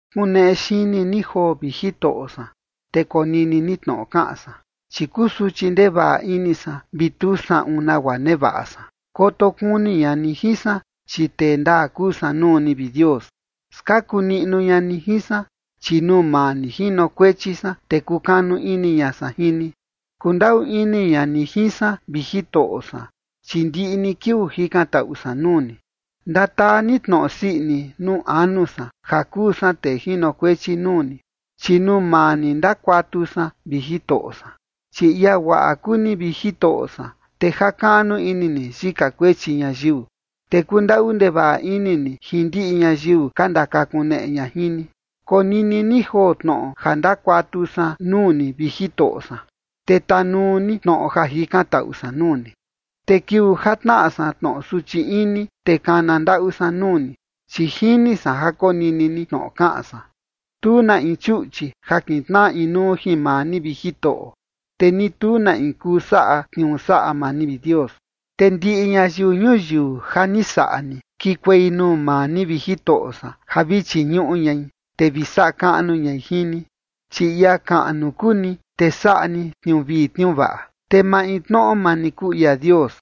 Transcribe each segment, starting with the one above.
Kuneꞌe xini ni joo, vi Jitoꞌo san, te konini ni tnoꞌo kaꞌan san, chi kusuchi ndevaꞌa ini san vi tu saꞌun nagua nevaꞌa san. Koto kuni ña ni jin san, chi tee ndaa kuu san nuu ni, vi Dios. Skaku niꞌnu ña ni jin san, chi nuu maa ni jinokuechi san, te kukanu ini ña san jin ni. Kundaꞌu ini ña ni jin san, vi Jitoꞌo san, chi ndiꞌi ni kiuu jikantaꞌu san nuu ni. Ndataa ni tnoꞌo sii ini nuu anu san ja kuu san tee jinokuechi nuu ni, chi nuu maa ni ndakuatu san, vi Jitoꞌo san. Chi ia guaꞌa kuu ni, vi Jitoꞌo san, te jakaꞌnu ini ni yika kuechi ñayiu, te kundaꞌu ndevaꞌa ini ni jin ndiꞌi ñayiu ka ndakakuneꞌe ña jin ni. Konini ni joo tnoꞌo ja ndakuatu san nuu ni, vi Jitoꞌo san, te tanuu ni tnoꞌo ja jikantaꞌu san nuu ni. Te kiuu ja tnaꞌa san tnoꞌo suchi ini, te kana ndaꞌu san nuu ni, chi jini san ja konini ni tnoꞌo kaꞌan san. Tu na in chuꞌchi ja kitnaꞌa inuu jin maa ni, vi Jitoꞌo, te ni tu na in kuu saꞌa tniuu saꞌa maa ni, vi Dios. Te ndiꞌi ñayiu ñuyiu ja ni saꞌa ni, kikuei nuu maa ni, vi Jitoꞌo san, ja vi chiñuꞌu ñai, te vi saꞌa kaꞌnu ñai jin ni. Chi ia kaꞌnu kuu ni, te saꞌa ni tniuu vii tniuu vaꞌa, te maintnoꞌo maa ni kuu ia Dios.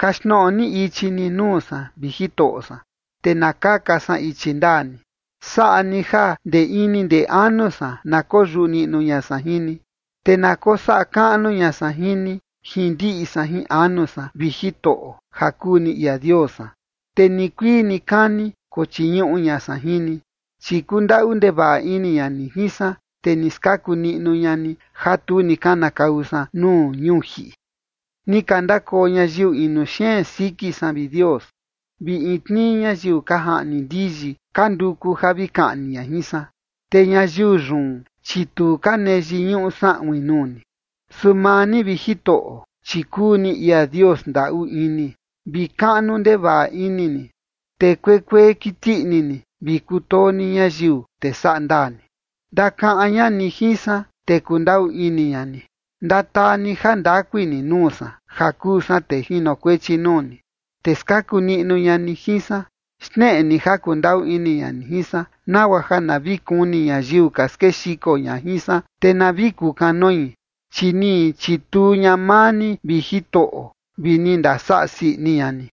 Kaxtnoꞌo ni ichi ni nuu san, vi Jitoꞌo san, te na kaka san ichi ndaa ni. Saꞌa ni ja ndee ini ndee anu san na koyuꞌu niꞌnu ña san jin ni. Te na kosaꞌa kaꞌnu ña san jin ni, jin ndiꞌi san jin anu san, vi Jitoꞌo, ja kuu ni ia Dios san, te nikuii nikani kochiñuꞌu ña san jin ni. Chi kundaꞌu ndevaꞌa ini ña ni jin san, te ni skaku niꞌnu ña ni ja tu ni kanakau san nuu ñuu jiꞌi. Ni ka ndakoo ñayiu inu xeen siki san, vi Dios, vi in tnii ñayiu ka jaꞌni ndiyi ka nduku ja vi kaꞌni ña jin san, te ñayiu yun, chi tu ka nee yiñuꞌu saꞌuin nuu ni. Su maa ni, vi Jitoꞌo, chi kuu ni ia Dios ndaꞌu ini vi kaꞌnu ndevaꞌa ini ni, te kuekuee kiti ini ni vi kutoo ni ñayiu, te saꞌa ndaa ni. Ndakaꞌan ña ni jin san, te kundaꞌu ini ña ni. Ndataa ni ja ndakui ni nuu san ja kuu san tee jinokuechi nuu ni, te skaku niꞌnu ña ni jin san. Xneꞌe ni ja kundaꞌu ini ña ni jin san, nagua ja na vi kuni ñayiu ka skexiko ña jin san, te na vi kukanoi, chi ni chituu ña maa ni, vi Jitoꞌo, vi ni ndasaꞌa sii ini ña ni.